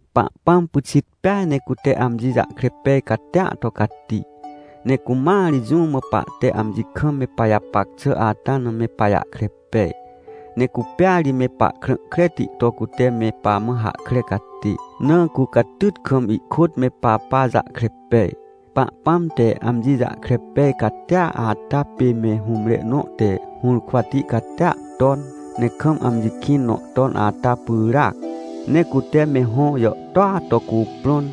Pahpãm pyxit peaj ne cute amji jahkre pej catia to cati. Ne cumãa ri jũ mã pahte amji kam me pajapac xà ata na me pajahkre pej. Ne cupêa ri me pahkrã kreti to cute me pamã hahkre catê, na cu catyt kam ihkôt me papa jahkre pej. Pahpãm te amji jahkre pej catia ata pê me hũmre nõ te hũrkwati catia ton, ne kam amji kĩn nõ ton ata pyràac. Ne cute me hõ jàhtôa to cuprõn,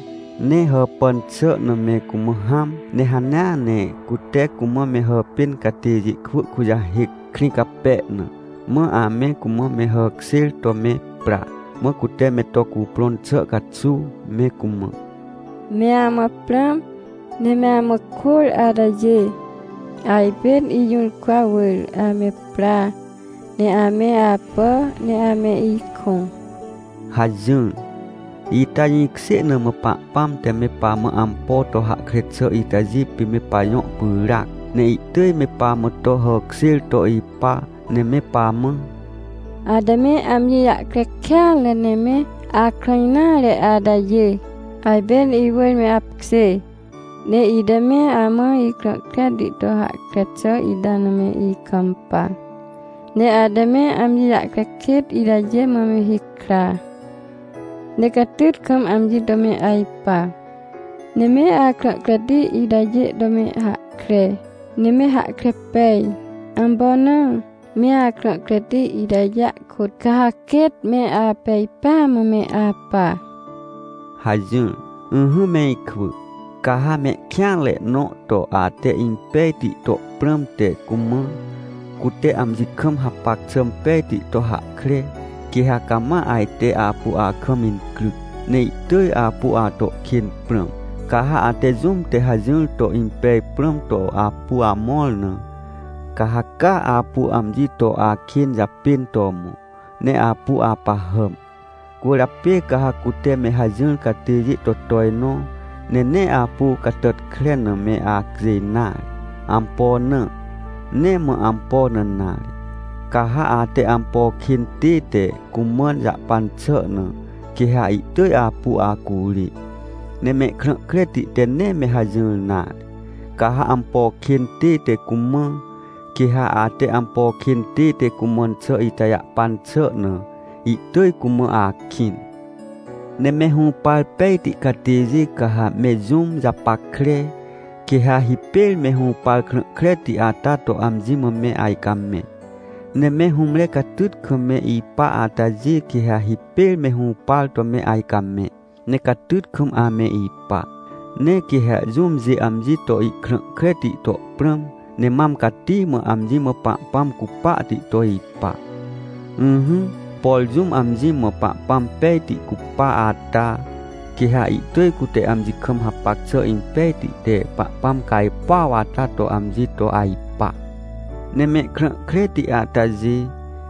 ne hàpàn xà na me cumã hãm. Ne hanea ne cute cumã me hàpên catêjê kwỳ kujahêc, krĩ cape na, mã ame cumã me hàkjêr to me pra, mã cute me to cuprõn xà caxuw me cumã: — Me amã prãm, ne me amã kôr atajê! Ajpên ijũrkwa wỳr ame pra ne ame apà ne ame ikõ! — hajỹr. Ita jĩkjê na mã Pahpãm te me pamã ampo to hahkre xà itajê pê me pajõ pyràac. Ne ihtỳj me pamã to hàkjêr to ipa ne me pamã: — Ate me amji jahkre kêatre ne me akrã nare atajê! Ajpên iwỳr me apkjê, ne ite me amã ikrã kreti to hahkre xà ita na me ikampa, ne ate me amji jahkre kêt itajê mã me hikra. Ne catyt kam amji to me ajpa. Ne me akrã kreti itajê to me hahkre, ne me hahkre pej. Ampo na? Me akrã kreti itajêa kôt ca ha quêt me apej pêa mã me apa — hajỹr. Ỹhỹ me ikwỳ, ca ha mehkêanre nõ to ate impejti to prãmte cumã, cute amji kam hapac xà pejti to hahkre, quê ha cama ajte apu akam incryc, ne ihtỳj apu ato kên prãm. Ca ha ate jũm te hajỹr to impej prãm to apu amõr na, ca ha caa apu amji to akên japên to mõ, ne apu apahàm. Cwỳrjapê ca ha cute me hajỹr catêjê to tojnõ, ne nee apu catàtkre na me acjêj nare. Ampo na? Nee mã ampo na nare, ca ha ate ampo kên tête cumãn jahpan xà na, quê ha ihtỳj apu acurê. Ne mehkrã kreti te nee me hajỹr nare. Ca ha ampo kên tête cumã, quê ha ate ampo kên tête cumãn xà ita jahpan xà na, ihtỳj cumã akĩn. Ne me hũpar pejti catêjê ca ha me jũm japackre, quê ha hipêr me hũpar krã kreti ata to amji mã me ajcamẽ. Ne me hũmre catyt kam me ipa atajê quê ha hipêr me hũpar to me ajcamẽ, ne catyt kam ame ipa. Ne quê ha jũmjê amji to ihkrã kreti to prãm, ne mam cati mã amji mã Pahpãm cupahti to ipa. Ỹhỹ, por jũm amji mã Pahpãm pejti cupa ata, quê ha ihtỳj cute amji kam hapac xà impejti te Pahpãm cajpuaw ata to amji to ajpa. Ne mehkrã kreti atajê,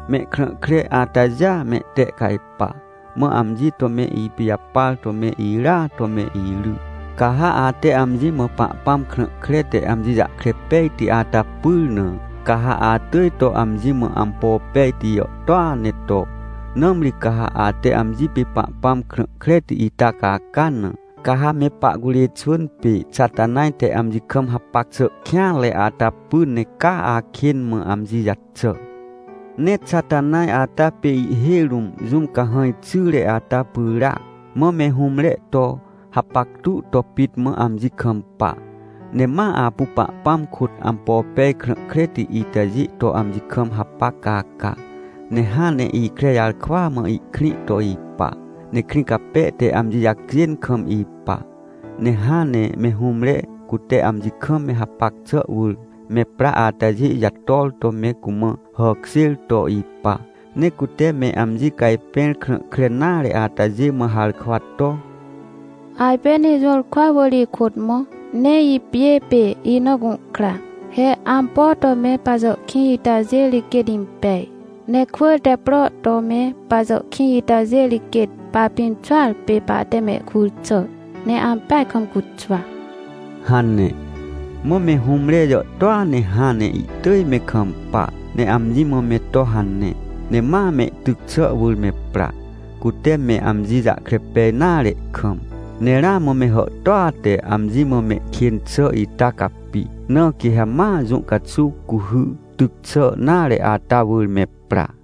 mehkrã kre atajêa mehtehcajpa, mã amji to me ipijapar to me irya to me iry. Ca ha ate amji mã Pahpãm krã kre te amji jahkre pejti ata pyr na, ca ha atỳj to amji mã ampo pejti jàhtôa ne to. Nãmri ca ha ate amji pê Pahpãm krã kreti ita caca na, ca ha me pahcurê xwỳn pê Xatanaj te amji kam hapac xà kêanre ata py ne caa akên mã amji jaxà. Ne Xatanaj ata pê ihhêj rũm jũm cahãj xyre ata pyràac, mã me hũmre to hapactu to pit mã amji kampa, ne ma apu Pahpãm kôt ampo pej krã kreti itajê to amji kam hapac caca. Ne hãn ne ikre jarkwa mã ihkrĩ to ipa, ne krĩ cape te amji jacjên kam ipa. Ne hãn ne me hũmre, cute amji kam me hapac xà wỳr me pra atajê jator to me cumã hàkjêr to ipa. Ne cute me amji cajpẽr, krã kre nare atajê mã harkwa to: — Ajpên ijũrkwa wỳr ikôt mõ, ne ipjê pê ina gũhkra! He, ampo to me pajàhkĩj itajê ri quêt impej! Ne kwỳr te pro to me pajàhkĩj itajê ri quêt papimxuar pê pahte mehkur xà, ne ampeaj kam cuxwa! — hane. Mã me hũmre jàhtôa ne hãn ne ihtỳj me kampa, ne amji mã me to hane, ne ma mehtyc xà wỳr me pra, cute me amji jahkre pej nare kam. Ne ramã me hàhtôa te amji mã mehkên xà ita capi, na quê ha ma jũ caxuw cuhy tyc xà nare ata wỳr me pra.